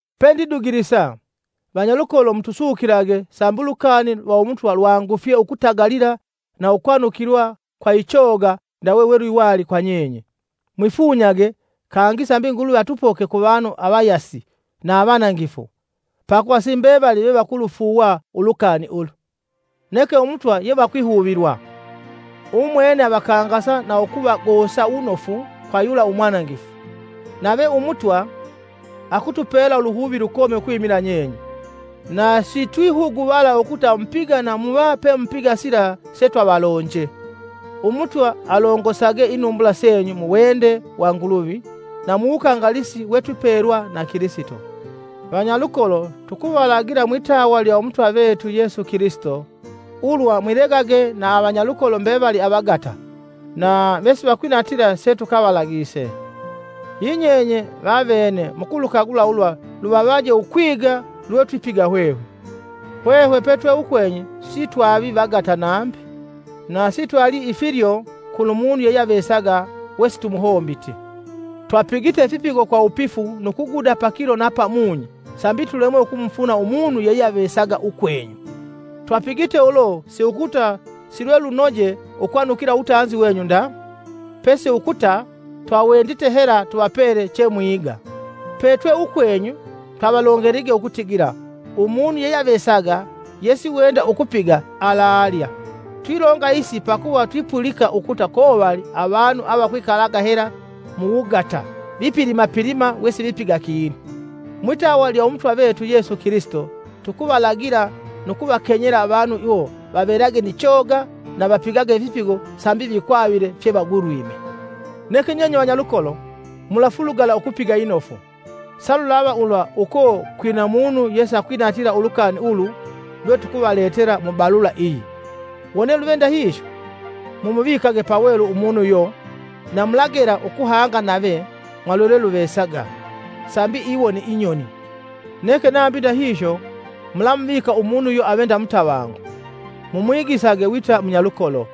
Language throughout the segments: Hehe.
Pendidugulisa, vanyalukolo mutusukilage, sambi ulukani lwa Umutwa lwangufya ukutagalila na ukwanukilwa kwa ichoga ndawe we lwiwali kwa nyenye. Mwifunyage kangi sambi Nguluvi atupoke kuvanu avayasi na avanangifu, pakuva si mbevali vevakulufuuwa ulukani ulu. Neke Umutwa yevakwihuvilwa. Umwene avakangasa na ukuvagosa wunofu kwa yula umwanangifu. Nave Umutwa akutupela uluhuvi lukomi ukwimila nyenye, na sitwihuguvala ukuta mupiga na muva pemupiga sila setwavalonje. Umutwa alongosage inumbula senyu mu wende wa Nguluvi na mu wukangalisi we twipelwa na Kilisito. Vanyalukolo tukuvalagila mwitawa lya Umutwa vetu Yesu Kilisito ulwa mwilegage na avanyalukolo mbevali avagata na vesivakwinatila setukavalagise. Yinyenye vavene mukulukagula ulwa luvavaje ukwiga lwetwipiga hwehwe. Hwehwe petwe ukwenyu sitwavi vagata nambi. Na sitwalii ifilyo kulumunu yeyeavesaga we situmuhombiti. Twapigite ifipigo kwa wupifu nu kuguda pakilo na pamunyi sambi pakilo sambi tulemwe ukumufuna umunu yeyeavesaga ukwenyu. Twapigite ulo si ukuta si lwelunoje ukwanukila uwutanzi wenyu nda, pesi ukuta twawendite hela tuvapele chemwiga. Petwe ukwenyu, twavalongelige ukutigila, “Umunu yeyeavesaga yesiwenda ukupiga, alalya.” Twilonga isi pakuva twipulika ukuta kovali avanu avakwikalaga hela muwugata vipilimapilima wesivipiga kinu. Mwitawa lya Umutwa vetu Yesu Kilisito tukuvalagila nu kuvakenyela avanu iwo vavelage ni choga na vapigage ifipigo sambi vikwavile fyevagulwime. Neke nyenye vanyalukolo, mufulugala ukupiga inofu. Sa lulava ulwa uko kwina munu yesakwinatila ulukani ulu lwetukuvaletela mu balula iyi. Wone luve ndahihyo, mumuvikage pawelu umunu uyo na mulagela ukuhanga nave mwa lwelweluvesaga, sambi iwone inyoni. Neke nambi ndahihyo, mulamuvika ukumulava umunu uyo ave nda, mumwigisage wita munyalukolo.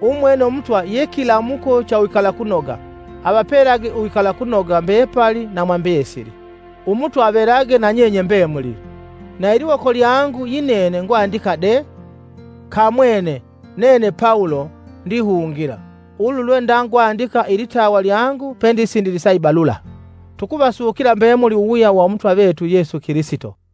Umwene Umutwa ye kilamuko cha uwikalakunoga, avapelage uwikalakunoga mbepali na mwa mbesili. Umutwa avelage nanyenye mbemuli. Na iliwoko lyangu yinene ngwandika de: Kamwene nene Pawulo ndihungila! Ulu lwe ndangwandika ilitawa lyangu pendisindilisa ibalula. Tukuvasukila mbemuli uwuwuya wa Umutwa vetu Yesu Kilisito.